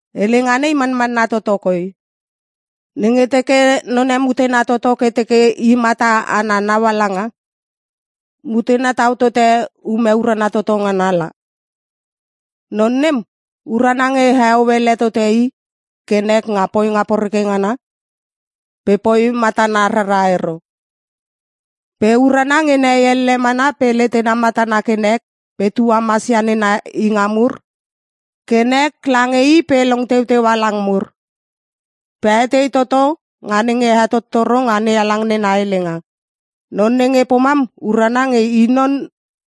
Helenga nei manmanna toto koi. Nenge teke none mutena toto ke teke i mata ana naungaala, mutena tau tote ume urana toto ngana la. Non nem urana nge heo ele tote i ke nek nga poinga poreke ngana pe poi matana rara ero. Pe urana nge nehei elle mana pe letena matana ke nek pe tuamasia nena inga mur pe hehei pe hana tepoi ke nek lange i pe long teuteua lang mur, pe etei toto nga nenge hetottoro nga NeHalang nena helenga. Non nenge pomam urana nge i non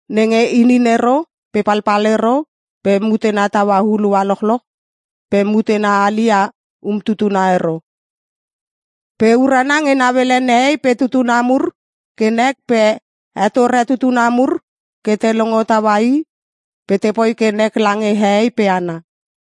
nenge inin ero pe palpal ero pe mutena taua hulua lochloch pe mutena hali ia umtutuna ero. Pe urana nge nauele nehei pe tutuna mur ke nek pe hetore tutuna mur ke te longo taua i pe tepoi ke nek lange hehei pe hana.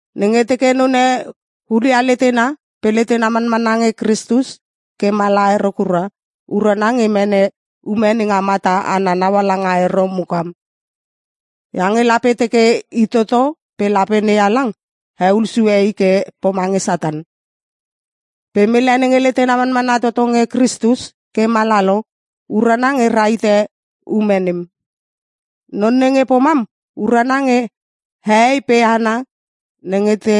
Nenge teke none hulia letena pe letena manmanna nge Kristus ke mala ero kura, urana nge mene ume nenga mata ana naungaala ero mukam. Iange lape teke i toto pe lape NeHalang heul sue i ke pomange Satan. Pe mele nenge letena manmanna toto nge Kristus ke mala lo, urana nge rahite ume nem. Non nenge pomam, urana nge hehei pe hana nenge te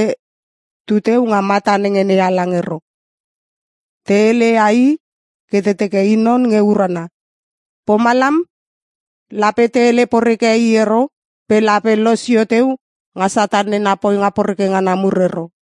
tuteu nga mata nenge NeHalang ero, te heleia i ke te teke i non nge urana. Pomalam lape te hele poreke i ero pe lape losio teu nga Satan na poinga poreke ngana mur ero.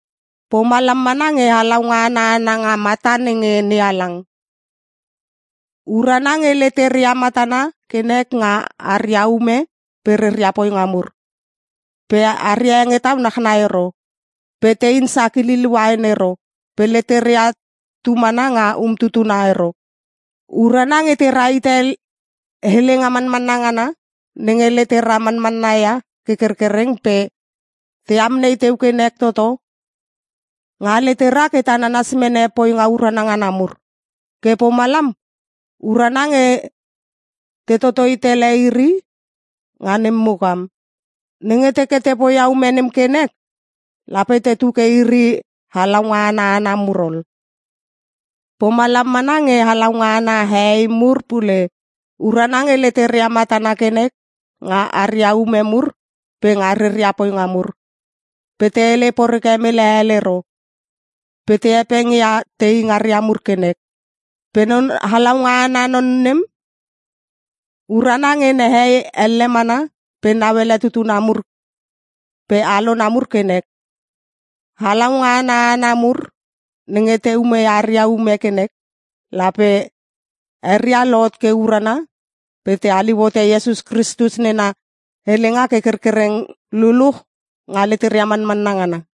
Pomalam mana nge halaunga ana hana nga mata nenge NeHalang. Urana nge leteria matana ke nek nga aria ume pe reria poinga mur, pe aria hengetau nachnai ero. Pe tein sakililia uain ero pe leteria tumana nga umtutuna ero. Urana nge te rahite helenga manmanna ngana nenge letera manmanna ia ke kerkereng pe te amnei teu ke nek toto nga leteria ke te nanas mene poinga urana ngana mur. Ke pomalam urana nge te totoi tele iri nga nem mukam. Nenge teke te poia ume nem ke nek, lape tetu ke iri halaunga ana hana mur ol. Pomalam mana nge halaunga ana hehei mur pule. Urana nge leteria matana ke nek nga aria ume mur pe nga reria poinga mur, pe te hele poreke mele hel ero pe te hepengia tei ngaria mur ke nek. Pe non halaunga ana non nem urana nge nehei elle mana pe nauele tutuna mur pe alona mur ke nek. Halaunga ana hana mur nenge te umeia aria ume ke nek lape eria lohot ke urana pe te haliu hote Iesus Kristus nena helenga ke kerkereng luluch nga leteria manmanna ngana.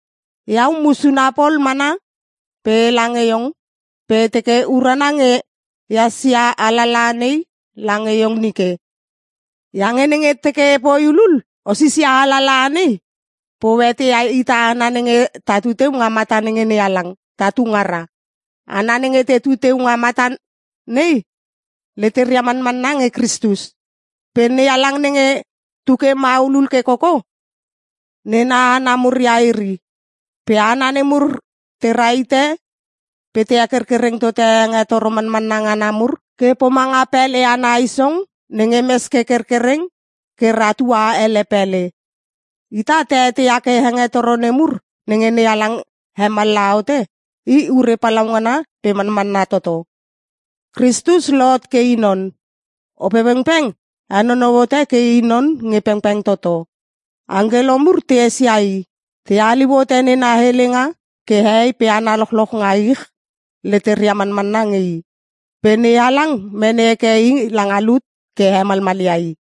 Iau, musuna pol mana pe ela nge iong pe e teke urana nge ehas ia alalaha nei lange iong nike. Iange nenge teke epoi hulul, o sisia alalaha nei pe o eteia ita hana nenge tatu teu nga mata nenge NeHalang, tatu ngara. Hana nenge tetu teu nga mata nei leteria manmanna nge Kristus. Pe NeHalang nenge tuke maulul ke koko nena hana mur ia iri. Pe hana nemur te rahite pe te hekerkereng tote hengetoro manmanna ngana mur ke pomanga pele ana isong nenge mes ke kerkereng ke rahtua ele pele. Ita ta eteia ke hengetoro nemur nenge NeHalang hemallaha hote, i ure palaungana pe manmanna toto: Kristus lohot ke i non. Opepengpeng henonou hote ke I non nge pengpeng toto. Angkelo mur te esia I. Te haliu hote nena helenga ke hehei pe hana lochloch nga ich leteria manmanna nge I. Pe NeHalang mene heke I langa lut ke hemalmalia I.